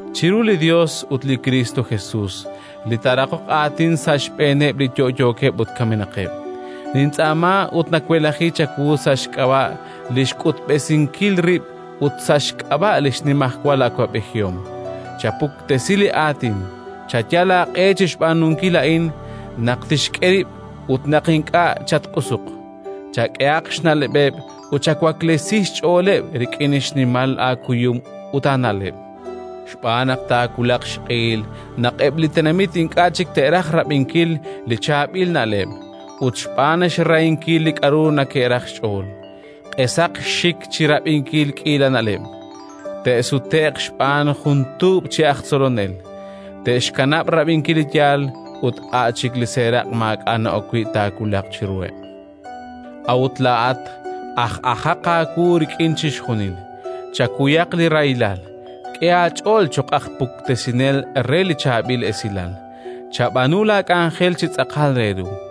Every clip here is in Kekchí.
Chiru li Yos ut li Kristo Jesus li taaraqoq aatin sa' xb'eeneb' li yo'yookeb' ut kamenaqeb', nintz'aama ut nawelaji chawu sa' xk'ab'a' li xk'utb'esinkil rib' ut sa' xk'ab'a' li xnimajwal awab'ejihom: chapuktesi li Aatin, chayal aaq'e chi xb'aanunkil a'in naq tixk'e rib' ut naq ink'a'; chatq'usuq, chak'ehaq xna'leb'eb' ut chawaklesi xch'ooleb' rik'in xnimal aakuyum ut aana'leb'. Xb'aan naq taawulaq xq'ehil naq eb' li tenamit ink'a' chik te'raj rab'inkil li chaab'il na'leb' ut, xb'aan xrahinkil li k'aru neke'raj xch'ool, q'esaq xxik chi rab'inkil k'iila na'leb', te'sute'q xb'aan jun tuub' chi aj tzolonel; te'xkanab' rab'inkil li yaal ut a' chik li seeraq' maak'a' na'ok wi' taawulaq chiruheb'. A'ut laa'at aj'ajaq aawu rik'in chixjunil, chakuyaq li rahilal, k'e aach'ool cho'q aj puktesinel re li Chaab'il Esilal, chab'aanu laak'anjel chi tz'aqal re ru.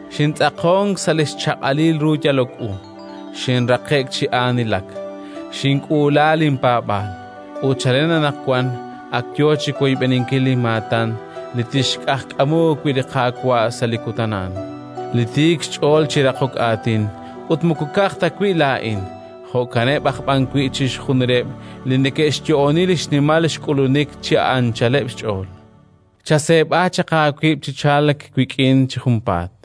Xintz'aqonk sa' li xchaq'alil ru yalok u, xinraqe'k chi aanilak, xink'uula linpaab'aal. Ut chalen anaqwan ak yo chi woyb'eninkil linmaatan li tinxq'ajkamu wi' li Qaawa' sa' li Kutan a'an, li tiik xch'ool chi raqok aatin; ut moko ka'aj ta wi' laa'in, jo'kaneb' aj b'an wi' chixjunileb' li neke'xyo'oni li xnimal xk'ulunik chi anchaleb' xch'ool. Chaseeb'a chaq aawib' chi chalk wik'in chi junpaat: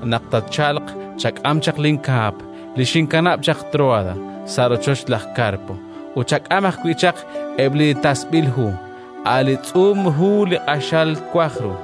Naq tatchalq, chak'am chaq linkaap li xinkanab' chaq Tróada, sa' rochoch laj Karpo, ut chak'am ajwi' chaq eb' li tasb'il hu, a' li tz'uum hu li q'axal twaj ru.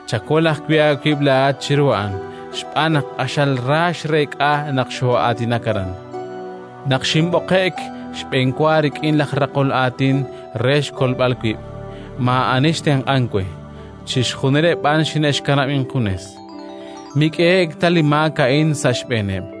Chakol ajwi' aawib' laa'at chiru a'an, xb'aan naq q'axal ra xreek'a naq xoo'aatinak aran. Naq xinb'oqe'k xb'enwa rik'in laj raqol aatin re xkolb'al wib', maa'ani xtenq'ank we, chixjunileb' b'an xine'xkanab' injunes. Mik'ehe'k ta li maak a'in sa' xb'eeneb'.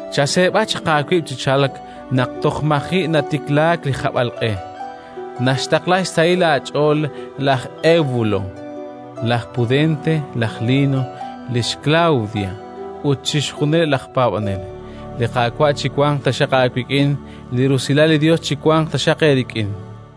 Chaseeb'a chaq aawib' chi chalk naq toj maji' natiklaak li hab'alq'e. Naxtaqla xsahil aach'ool laj Ewbulo, laj Pudente, laj Lino, lix Klawdia ut chixjunileb' laj paab'anel. Li Qaawa' chiwanq taxaq aawik'in. Li rusilal li Yos chiwanq taxaq eerik'in.